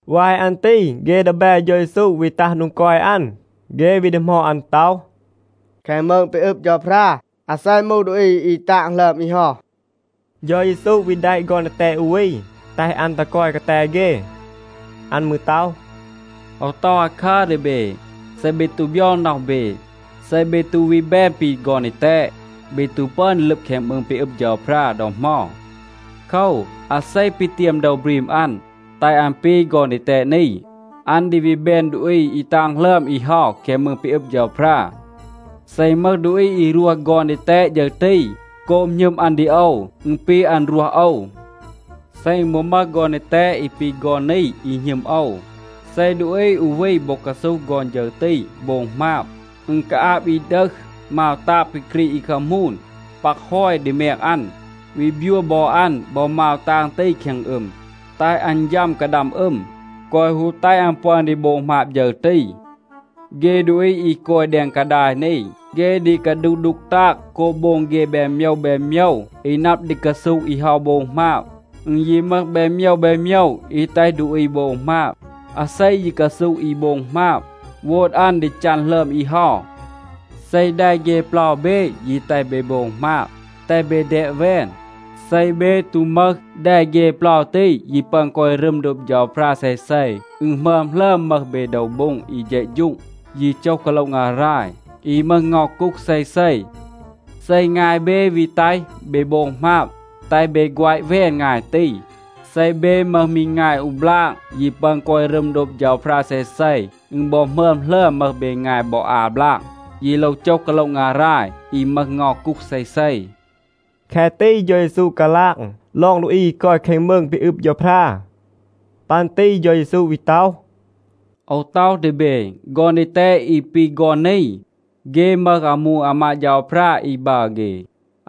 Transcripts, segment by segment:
วาย อัน ตี เฆ ดีแบ เฌา เยซู วี ตัห โดง กอย อัน. เฆ วี ดีหมอด อัน ต็อห, “แคง มืง ปี อึบ เฌาพรา, อาเซ มูห ดูอี อี ตาง หลึอม อี เฮา?” เฌา เยซู วี แดะ ฆอน ดีแตด อู วี, แตห อัน ตัห กอย กาแต เฆ. อัน มืร ต็อห, “โอว ต็อห อาคัร ดี เบ. เซ เบ ตู บยอง น็อห เบ, เซ เบ ตู วี แบน ปี ฆอน ดีแตด, เบ ตู ปึอน ดี ลึบ แคง มืง ปี อึบ เฌาพรา ดอ เหมา. โคว, อาเซ ปีเตียม โดว บรีม อัน, แตห อัน ปี ฆอน ดีแตด นี, อัน ดี วี แบน ดูอี อี ตาง หลึอม อี เฮา แคง มืง ปี อึบ เฌาพรา. เซ อึณ มึห ดูอี อี รวห ฆอน ดีแตด ฌึร ตี โกบ หณึม อัน ดี โอว, อึณ ปี, อัน รวห โอว. เซ อึณ บอ มึห ฆอน ดีแตด อี ปี ฆอน นี อี หณึม โอว, เซ ดูอี อู วี บอ กาซูห ฆอน ฌึร ตี โบง หมาบ, อึณ กาอาบ อี ดึห มาว ตาง ปี กรีด อี คามูน, ปัก ฮอย ดี แมง อัน, วี บยัว บอ อัน บอ มาว ตาง ตี แคง อึม, แตห อัน ยัม กาดัม อึม, แกวะ ฮู แตห อัน ปึอน ดี โบง หมาบ ฌึร ตี. เฆ ดูอี อี กอย แดง กาดาย นี, เฆ ดี กาดูห ดูก ตาง โกบ โบง เฆ แบน โมยว แบน โมยว อี นับ ดี กาซูห อี เฮา โบง หมาบ. อึณ ยี มึห แบน โมยว แบน โมยว อี แตห ดูอี โบง หมาบ. อาเซ ยี กาซูห อี โบง หมาบ, โวด อัน ดี จัน หลึอม อี เฮา. เซ แด เฆ เปลา เบ ยี แตห เบ โบง หมาบ, แตห เบ แดบ แวน. เซ เบ ตู มึห แด เฆ เปลา ตี, ยี ปึอน กอย รึม โดบ เฌาพรา เซเซ, อึณ หมึอม หลึอม มึห เบ โดว โบ็ง อี เฌะฌูง, ยี โจห กาโละ งาราย, อี มึห เงา กูห เซเซ. เซ งาย เบ วี แตห เบ โบง หมาบ, แตห เบ แฆวะ แวน งาย ตี. เซ เบ มึห มี งาย อู บลาก ยี ปึอน กอย รึม โดบ เฌาพรา เซเซ, อึณ บอ หมึอม หลึอม มึห เบ งาย บอ อา บลาก, ยี โลว โจห กาโละ งาราย อี มึห เงา กูห เซเซ.” แคะ ตี เฌา เยซู กาลาง ลอง ดูอี อี กอย แคง มืง ปี อึบ เฌาพรา. ปัน ตี เฌา เยซู วี ต็อห, “โอว ต็อห ดี เบ, ฆอน ดีแตด อี ปี ฆอน นี, เฆ มึห อามู อามาด เฌาพรา อี บัร เฆ.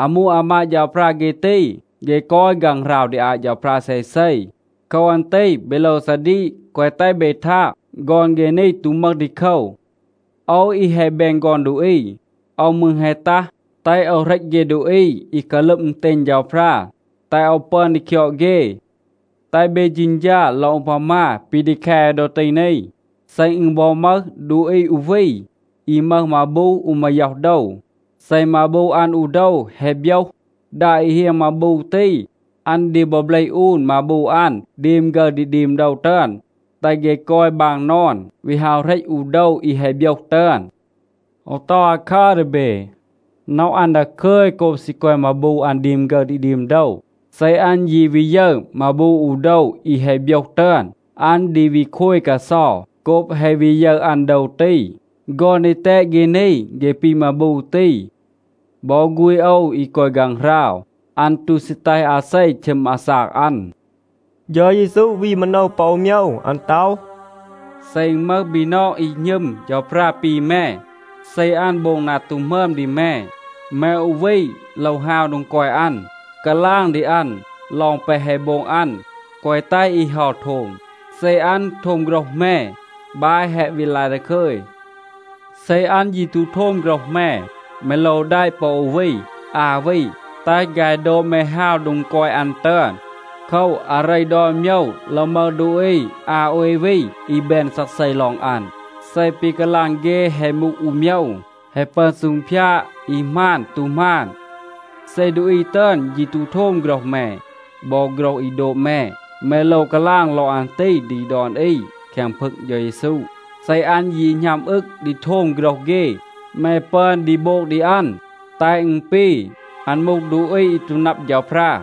อามู อามาด เฌาพรา เฆ ตี, เฆ กอย ฆางหราว ดี อาต เฌาพรา เซเซ. โคว อัน ตี เบ โลว ซาดีก, แกวะ แตห เบ ทาง, ฆอน เฆ นี ตู มึห ดีโคว. โอว อี แฮะ แบน ฆอน ดูอี, โอว มืร แฮะ ตัห, แตห โอว เหรต เฆ ดูอี อี กาลึบ อึณเตณ เฌาพรา, แตห โอว ปึอน ดี คยอด เฆ. แตห เบ เฌณฌา ลอง อูพามา ปี ดี แค โอว ดอ ตี นี. เซ อึณ บอ มึห ดูอี อู วี, อี มึห มาบู อู มาย็อห โดว, เซ มาบู อัน อู โดว แฮะ โบยห, ดา อี เฮียง มาบู ตี, อัน ดี บอ เบลห อูน มาบู อัน ดีม ฆึร ดี ดีม โดว ตึอน, แตห เฆ กอย บาง นอน, วี ฮาว เหรต อู โดว อี แฮะ โบยห ตึอน. โอว ต็อห อาคัร ดี เบ. น็อห อัน ดาคึย โกบ ซี กอย มาบู อัน ดีม ฆึร ดี ดีม โดว. เซ อัน ยี วี ยึร มาบู อู โดว อี แฮะ โบยห ตึอน, อัน ดี วี โคย กาเซา โกบ แฮะ วี ยึร อัน โดว ตี. ฆอน ดีแตด เฆ นี, เฆ ปี มาบู ตี. บอ ฆูณ โอว, อี กอย ฆางหราว, อัน ตู ซี แตห อาเซ ชึม อาซาก อัน.” เฌา เยซู วี มาโนว ปอ อู โมยว. อัน ต็อห, “เซ อึณ มึห บีนอง อี หณึม เฌาพรา ปี แม, เซ อัน โบง นา ตู หมึอม ดี แม, แม อู วี โลว ฮาว โดง กอย อัน, กาลาง ดี อัน ลอง แปะ แฮะ โบง อัน, แกวะ แตห อี เฮา โทม. เซ อัน โทม โฆรห แม, บาย แฮะ วี ลาย ดาคึย. เซ อัน ยี ตู โทม โฆรห แม, แม โลว แดะ ปอ อู วี, อา วี, แตห ฆาย โดบ แม ฮาว โดง กอย อัน ตึอน. โคว, อาเร ดอน โมยว โลว มึห ดูอี อา โอย วี อี แบน ซักเซ ลอง อัน. เซ ปี กาลาง เฆ แฮะ มูห อู โมยว, แฮะ ปึอน ซูงพยาด อี หมาน ตู หมาน. เซ ดูอี ตึอน ยี ตู โทม โฆรห แม บอ โฆรห อี โดบ แม, แม โลว กาลาง ลอง อัน ตี ดี ดอน อี แคง พึง เฌา เยซู. เซ อัน ยี หณัม อึง ดี โทม โฆรห เฆ, แม ปึอน ดี โบง ดี อัน, แตห อึณ ปี, อัน มูห ดูอี อี ตู นับ เฌาพรา.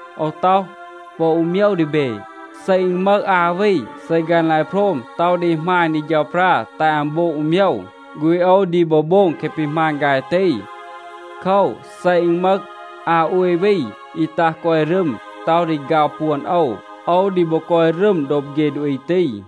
โอว ต็อห ปอ อู โมยว ดี เบ. เซ อึณ มึห อา วี, เซ ฆาย ลาย โพรม, ต็อห ดี หมาณ ดี เฌาพรา แตห อัน โบง อู โมยว, ฆูณ โอว ดี บอ โบง แคะ ปี หมาณ ฆาย ตี. โคว, เซ อึณ มึห อา โอย วี อี ตัห กอย รึม, ต็อห ดี ฆาว ปวน โอว, โอว ดี บอ กอย รึม โดบ เฆ ดูอี ตี.”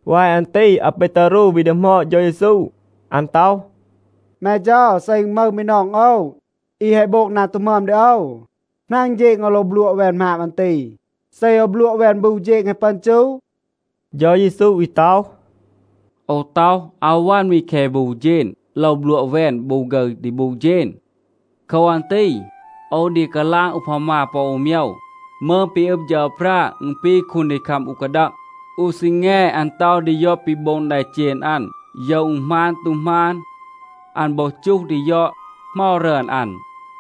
วาย อัน ตี อาเปตารู วี ดีหมอด เฌา เยซู. อัน ต็อห, “แม เฌา, เซ อึณ มึห บีนอง โอว, อี แฮะ โบง นา ตู หมึอม ดี โอว, หนาง เฌณ โอว โลว บลัวะ แวน หมาบ อัน ตี? เซ โอว บลัวะ แวน บู เฌณ แฮะ ปึอน จู?” เฌา เยซู วี ต็อห, “โอว ต็อห, อาว วัน มี แคะ บู เฌณ. โลว บลัวะ แวน บู ฆึร ดี บู เฌณ. โคว อัน ตี โอว ดี กาลาง อูพามา ปอ อู โมยว. มืง ปี อึบ เฌาพรา, อึณ ปี คูนดีคัม อู กาดัง. อู ซีแง อัน ต็อห ดี ยอด ปี โบง แดเจณ อัน, โยว อึณ หมาน ตู หมาน. อัน บอ จูห ดี ยอด เหมา รึอน อัน.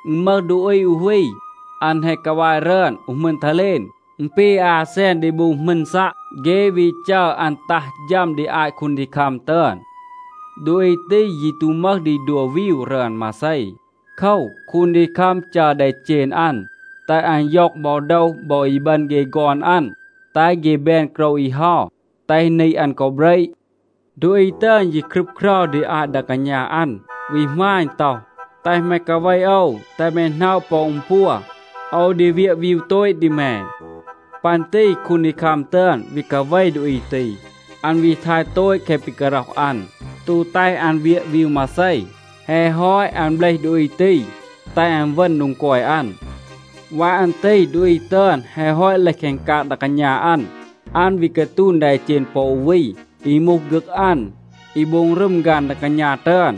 อึณ มึห ดูอี อู วี, อัน แฮะ กาวาย รึอน อู หมึณ ทาเลน (อึณ ปี อา แซน ดี บู หมึณ ซัะ).a เฆ วี จัร อัน ตัห ฌัม ดี อาต คูนดีคัม ตึอน. ดูอี ตี ยี ตู มึห ดี ดัว วีว รึอน มาเซ. โคว, คูนดีคัม จัร แดเจณ อัน, แตห อัน ย็อง บอ โดว บอ อีบึณ เฆ ฆอน อัน, แตห เฆ แบน โกรว อี เฮา, แตห นี อัน กอ เบระ. ดูอี ตึอน ยี ครึบเครา ดี อาต ดา กาณา อัน, วี หมาณ ต็อห, ‘แตห แม กาเว โอว, แตห แม หน็อะ ปอ อึณ ปัว. โอว ดี เวียะ วีว โตต ดี แม.’ ปัน ตี คูนดีคัม ตึอน วี กาเว ดูอี ตี. อัน วี ทาย โตต แคะ ปี การ็อห อัน, ตู แตห อัน เวียะ วีว มาเซ. แฮะ ฮอต, อัน เบลห ดูอี ตี, แตห อัน เวณ โดง กอย อัน. วาย อัน ตี ดูอี ตึอน แฮะ ฮอต เลห แคง กาง ดา กาณา อัน, อัน วี กาตูณ แดเจณ ปอ อู วี, อี มูห ฆึก อัน, อี โบง รึม ฆาน ดา กาณา ตึอน.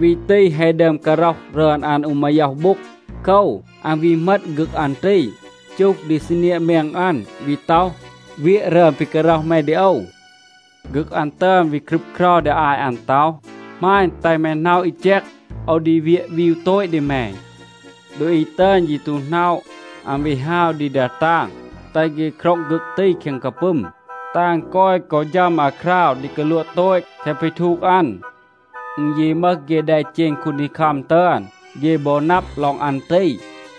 วี ตี แฮะ ดึอม การ็อห รึอน อัน อู มาย็อห โบ็ง.b โคว, อัน วี เหมต ฆึก อัน ตี, จูห ดี ซีเนียะ แมง อัน, วี ต็อห, ‘เวียะ รึอน ปี การ็อห แม ดี โอว.’ ฆึก อัน ตึอน วี ครึบเครา ดี อาต อัน, ต็อห, ‘หมาณ, แตห แม หน็อะ อี แจก, โอว ดี เวียะ วีว โตต ดี แม.’ ดูอี ตึอน ยี ตู หน็อะ. อัน วี ฮาว ดี ดา ตาง, แตห เฆ คร็อง ฆึก ตี แคง กาปึม, แตห อัน กอย กอ ฌัม อาคราว ดี กาลัวะ โตต แคะ ปี ทูก อัน. อึณ ยี มึห เฆ แดเจณ คูนดีคัม ตึอน, เฆ บอ นับ ลอง อัน ตี,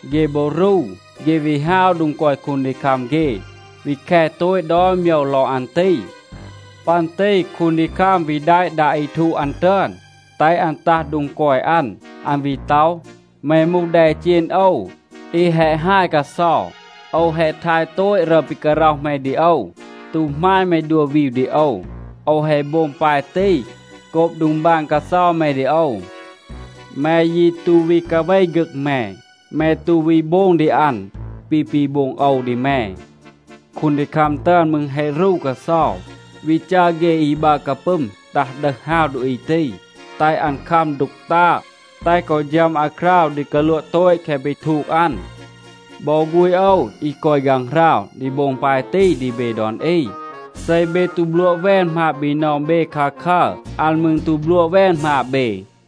เฆ บอ รู. เฆ วี ฮาว โดง กอย คูนดีคัม เฆ, วี แค โตต ดอน โมยว ลอง อัน ตี. ปัน ตี คูนดีคัม วี แดะ ดา อี ทูก อัน ตึอน แตห อัน ตัห โดง กอย อัน. อัน วี ต็อห, ‘แม มูห แดเจณ โอว, อี แฮะ ฮาย กาเซา. โอว แฮะ ทาย โตต รึอน ปี การ็อห แม ดี โอว, ตู หมาณ แม ดัว วีว ดี โอว. โอว แฮะ โบง ปาย ตี โกบ ดองบาน กาเซา แม ดี โอว. แม ยี ตู วี กาเว ฆึก แม. แม ตู วี โบง ดี อัน ปี ปี โบง โอว ดี แม.’ คูนดีคัม ตึอน มืร แฮะ รู กาเซา, วี จัร เฆ อี บัร กาปึม ตัห ดึห ฮาว ดูอี ตี, แตห อัน คัม ดูก ตาง, แตห กอ ฌัม อาคราว ดี กาลัวะ โตต แคะ ปี ทูก อัน. บอ ฆูณ โอว อี กอย ฆางหราว ดี โบง ปาย ตี ดี เบ ดอน อี. เซ เบ ตู บลัวะ แวน หมาบ บีนอง เบ คาคัร, อัน มืร ตู บลัวะ แวน หมาบ เบ.”